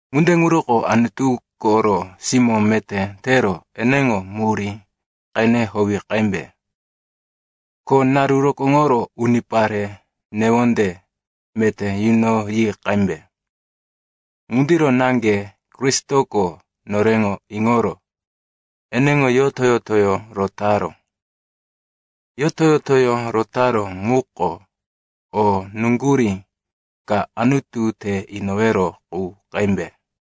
Ŋunde ŋuroko Anutu koro simó meté tero eneŋo murí qene howi qembe. Ko naru rokóŋoro unipare newonde meté yunoyi qembe. Ŋundiro naŋge Kristoko noreŋo iŋoro eneŋo yoto-yotoyó rotaró. Yoto-yotoyó rotaró ŋuko o nuŋgurí ka Anutu te inowero qu qembe.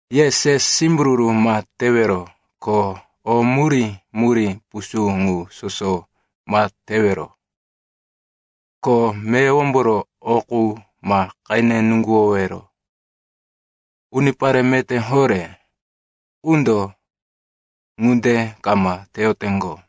Ye se simbururu ma tewero ko o murí-murí pusú ŋu soso ma tewero. Ko meyowomboro o qu ma qene nuŋguwowero. Unipare meté horé qundo ŋunde kama teyoteŋgo.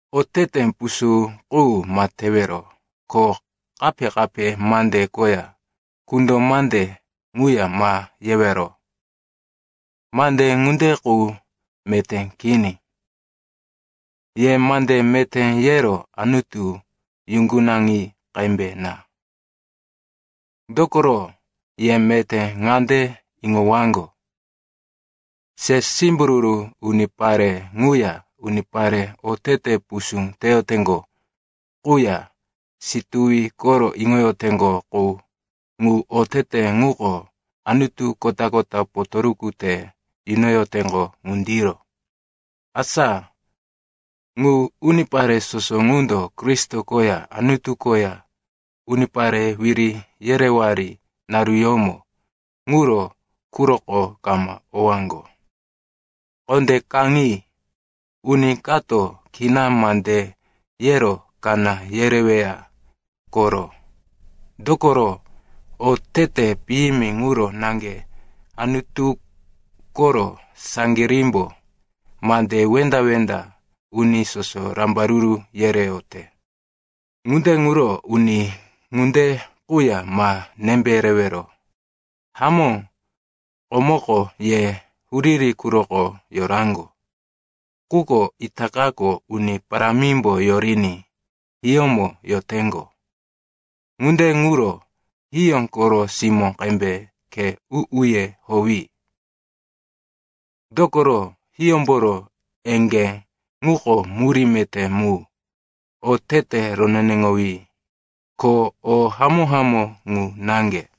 Otete pusú qu ma tewero, ko kape-kape mande koya kundo mande ŋuya ma yewero. Mande ŋunde qu meté kini. Ye mande meté yero Anutu yuŋgunaŋi qembe na. Dokoro ye meté ŋande iŋowaŋgo, se simbururu unipare ŋuya unipare otete pusú teyoteŋgo quya situwi koro iŋoyoteŋgo qu (ŋu otete ŋuko anutu kota-kota potoruku te yunoyoteŋgo ŋundiro). Asa ŋu unipare soso ŋundo Kristo koya Anutu koya unipare wiri yerewari naruyómo ŋuro quroko kama owaŋgo. Kondé kaŋi, uni kato kina mande yero kaná yereweya koro. Dokoro otete piyimi ŋuro naŋge Anutu koro saŋgirímbo mande wenda-wenda uni soso rambaruru yereyote. Ŋunde ŋuro uni ŋunde quya ma nembe rewero. Hamó, komoko ye huriri quroko yoraŋgo, quko itakako Uni Parámimbo yoriní hiyómo yoteŋgo. Ŋunde ŋuro hiyó koro simó qembe khe u-uye howi, dokoro hiyómboro eŋgé ŋuko murí meté mu, otete roneneŋowí, ko o hamó-hamó ŋu naŋge.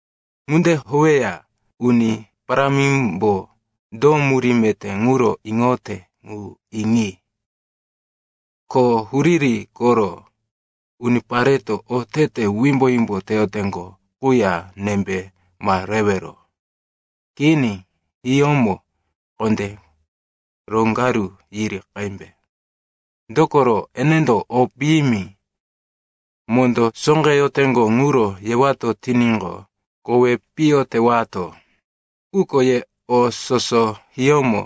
Ŋunde howeya Uni Parámimbo do murí meté ŋuro iŋoyote ŋu iŋi. Ko huriri koro unipareto otete wimbo-wimbo teyoteŋgo quya nembe ma rewero. Kini, hiyómo kondé roŋgaru yiri qembe. Dokoro enendo o piyimi mondó sóqeyoteŋgo ŋuro yewato tiníqo, kowi piyo tewato. Quko ye o soso hiyómo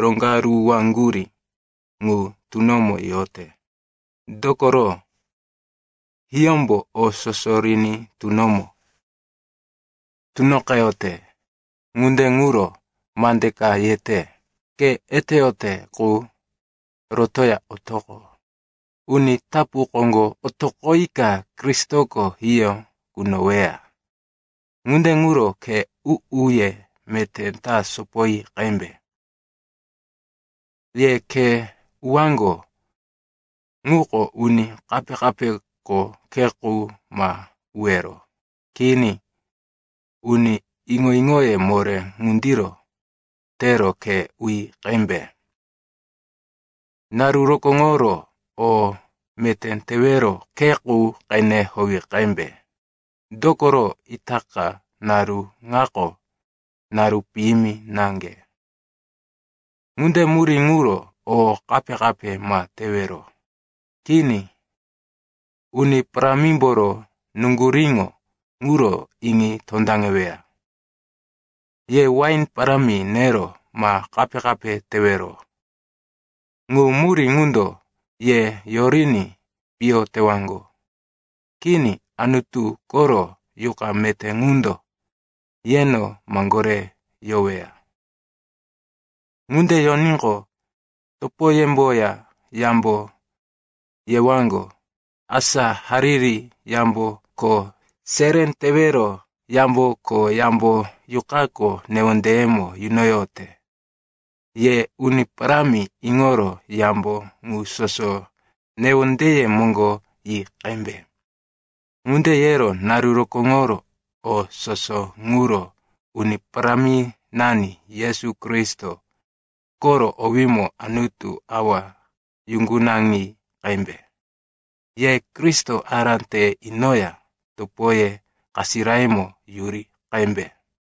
roŋgaruwaŋgurí ŋu tunomo yote. Dokoro hiyómbo o soso riní tunomo tunoqeyote. Ŋunde ŋuro mande ka yete, “Ke eteyote qu, rotoya otoqo, uni tapu koŋgo otoqoyika Kristoko hiyó kunoweya.” Ŋunde ŋuro khe u-uye meté ta sopoyi qembe. Ye khe uwaŋgo ŋuko uni kape-kapeko khe qu ma uwero. Kini, uni iŋo-iŋoye moré ŋundiro tero khe uyi qembe. Naru rokóŋoro o meté tewero khe qu qene howi qembe. Dokoro itaka naru ŋako naru piyimi naŋge. Ŋunde murí ŋuro o kape-kape ma tewero. Kini, Uni Parámimboro nuŋguríŋo ŋuro iŋi tondaŋeweya. Ye wain parámi nero ma kape-kape tewero. Ŋu murí ŋundo ye yoriní piyo tewaŋgo. Kini, Anutu koro Yuqa meté ŋundo yeno maŋgore yoweya. Ŋunde yoníqo, topoyemboya yambo yewaŋgo, asa hariri yambo ko seré tewero yambo ko yambo Yuqako newondeyemo yunoyote. Ye Uni Parámi iŋoro yambo ŋu soso newondeye moŋgo yi qembe. Ŋunde yero naru rokóŋoro o soso ŋuro Uni Paráminani Yesu Kristo koro owímo Anutu Awa yuŋgunaŋi qembe. Ye Kristo ará te inoya topoye kasirayemo yuri qembe.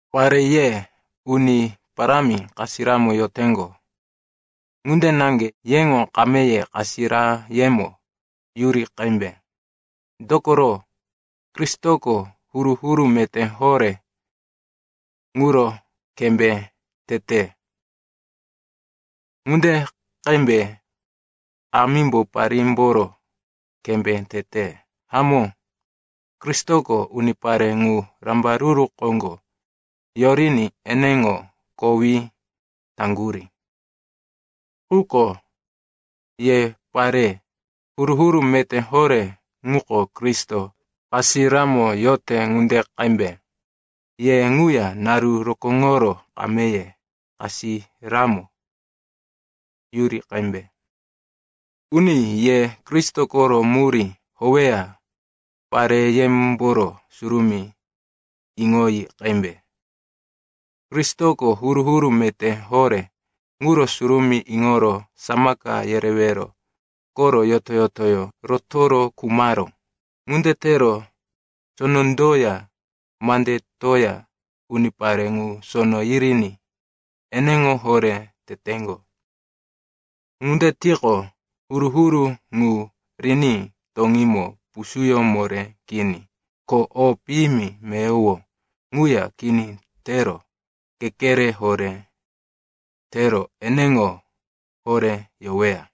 Pare, ye Uni Parámi kasiramo yoteŋgo ŋunde naŋge yeŋo kameye kasirayemo yuri qembe. Dokoro Kristoko huru-huru meté horé ŋuro kembé tete ŋunde qembe kamímbo parímboro kembé tete. Hamó, Kristoko unipare ŋu rambaruru koŋgo yoriní eneŋo kowí taŋgurí. Quko ye pare, huru-huru meté horé ŋuko Kristo kasiramo yote ŋunde qembe, ye ŋuya naru rokóŋoro kameye kasiramo yuri qembe. Uni, ye Kristo koro murí howeya pareyemboro surumí iŋoyi qembe. Kristoko huru-huru meté horé ŋuro surumí iŋoro samaka yerewero koro yoto-yotoyó rotoro khumaró. Ŋunde tero sonondoya mandetoya unipare ŋu sono yiriní eneŋo horé teteŋgo. Ŋunde tiqo, huru-huru ŋu riní toŋímo pusúyó moré kini ko o piyimi meyowo ŋuya kini tero kekere horé tero eneŋo horé yoweya.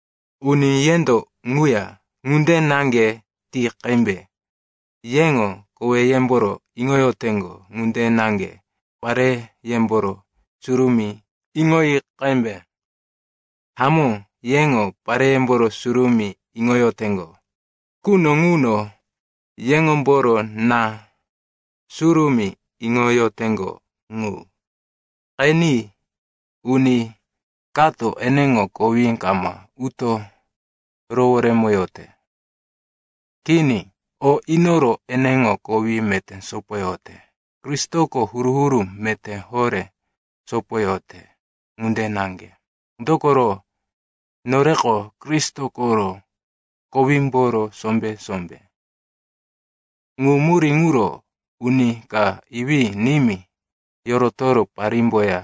Uni, yendo ŋuya ŋunde naŋge ti qembe. Yeŋo koweyemboro iŋoyoteŋgo ŋunde naŋge pareyemboro surumí iŋoyi qembe. Hamó, yeŋo pareyemboro surumí iŋoyoteŋgo quno ŋuno yeŋomboro na surumí iŋoyoteŋgo ŋu. Qeni, uni kato eneŋo kowí kama uto roworemoyote. Kini. O inoro eneŋo kowí meté sopoyote, Kristoko huru-huru meté horé sopoyote ŋunde naŋge, dokoro, noreko Kristo koro kowímboro sombé-sombé. Ŋu murí ŋuro “uni ka iwí-nimí yorotoro parímboya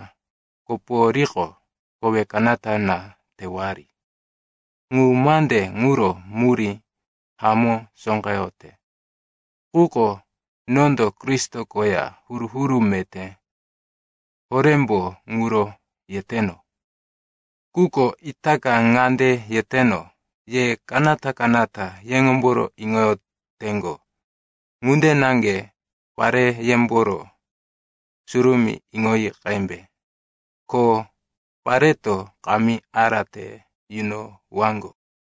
koporiqo, kowe kanata na tewari.” Ŋu mande ŋuro murí hamó sóqeyote, quko nondo Kristo koya huru-huru meté horémbo ŋuro yeteno. Quko itaka ŋande yeteno, ye kanata-kanata yeŋomboro iŋoyoteŋgo ŋunde naŋge pareyemboro surumí iŋoyi qembe. Ko pareto kamí ará te yunowaŋgo.